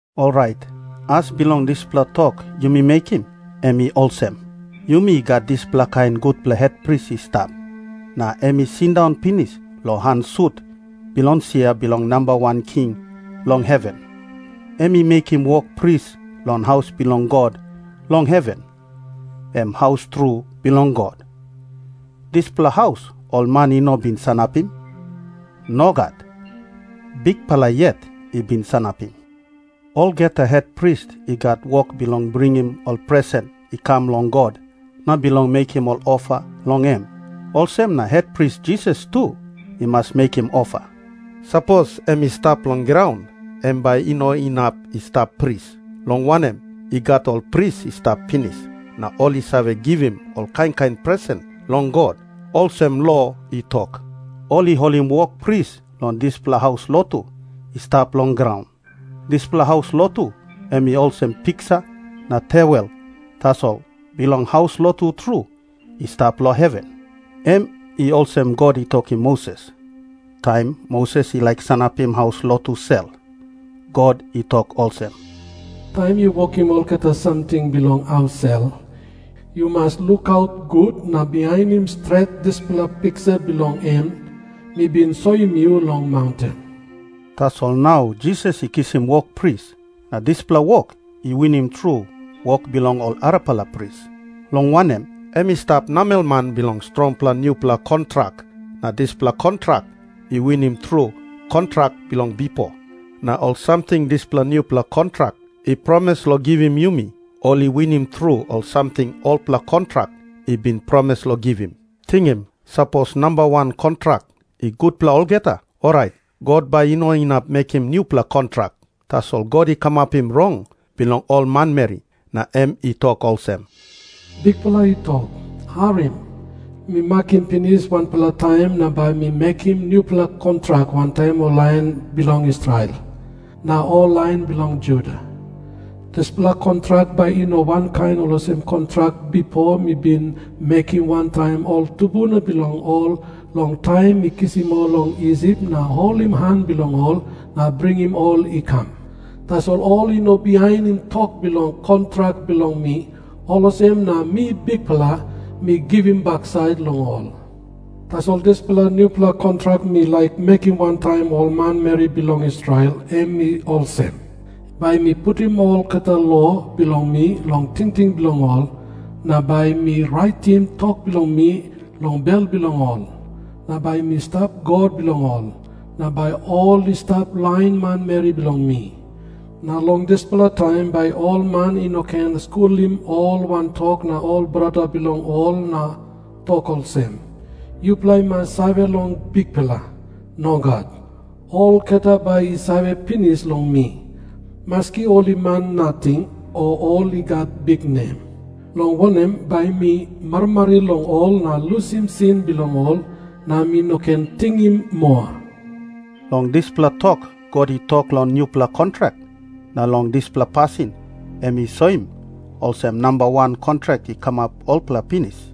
Orait as bilong dispela tok yumi mekim, em i olsem. Yumi gat dispela kain gutpela hetpris i stap, na em i sindaun pinis long han sut bilong sia bilong Namba Wan King long heven. Em i mekim wok pris long haus bilong God long heven, em haus tru bilong God. Dispela haus ol man i no bin sanapim. Nogat. Bikpela yet i bin sanapim. Olgeta hetpris i gat wok bilong bringim ol presen i kam long God na bilong mekim ol ofa long em. Olsem na Hetpris Jisas tu i mas mekim ofa. Sapos em i stap long graun, em bai i no inap i stap pris. Long wanem, i gat ol pris i stap pinis, na ol i save givim ol kain kain presen long God, olsem lo i tok. Ol i holim wok pris long dispela haus lotu i stap long graun. Dispela haus lotu em i olsem piksa na tewel tasol bilong haus lotu tru i stap long heven. Em i olsem God i tokim Moses, taim Moses i laik sanapim haus lotu sel. God i tok olsem, "Taim yu wokim olgeta samting bilong haus sel, yu mas lukaut gut na bihainim stret dispela piksa bilong en mi bin soim yu long maunten." Tasol nau Jisas i kisim wok pris, na dispela wok i winim tru wok bilong ol arapela pris. Long wanem, em i stap namelman bilong strongim nupela kontrak, na dispela kontrak i winim tru kontrak bilong bipo. Na ol samting dispela nupela kontrak i promis long givim yumi, ol i winim tru ol samting olpela kontrak i bin promis long givim. Tingim. Sapos namba wan kontrak i gutpela olgeta, orait God bai i no inap mekim nupela kontrak. Tasol God i kamapim rong bilong ol manmeri na em i tok olsem, "Bikpela i tok, 'Harim. Mi makim pinis wanpela taim na bai mi mekim nupela kontrak wantaim ol lain bilong Israel na ol lain bilong Juda. Dispela kontrak bai i no wankain olsem kontrak bipo mi bin mekim wantaim ol tumbuna bilong ol long taim mi kisim ol long Isip na holim han bilong ol na bringim ol i kam. Tasol ol i no bihainim tok bilong kontrak bilong mi, olsem na mi Bikpela, mi givim baksait long ol. Tasol dispela nupela kontrak mi laik mekim wantaim ol manmeri bilong Israel, em i olsem. Bai mi putim olgeta lo bilong mi long tingting bilong ol, na bai mi raitim tok bilong mi long bel bilong ol. Na bai mi stap God bilong ol, na bai ol i stap lain manmeri bilong mi. Na long dispela taim bai ol man i no ken skulim ol wantok na ol brata bilong ol na tok olsem, "Yupela i mas save long Bikpela." Nogat. Olgeta bai i save pinis long mi, maski ol i man nating o ol i gat biknem. Long wanem, bai mi marimari long ol na lusim sin bilong ol na mi no ken tingim moa.' " Long dispela tok God i tok long nupela kontrak, na long dispela pasin em i soim olsem namba wan kontrak i kamap olpela pinis.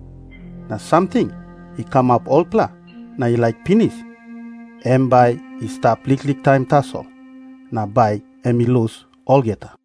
Na samting i kamap olpela na i laik pinis, em bai i stap liklik taim tasol, na bai em i lus olgeta.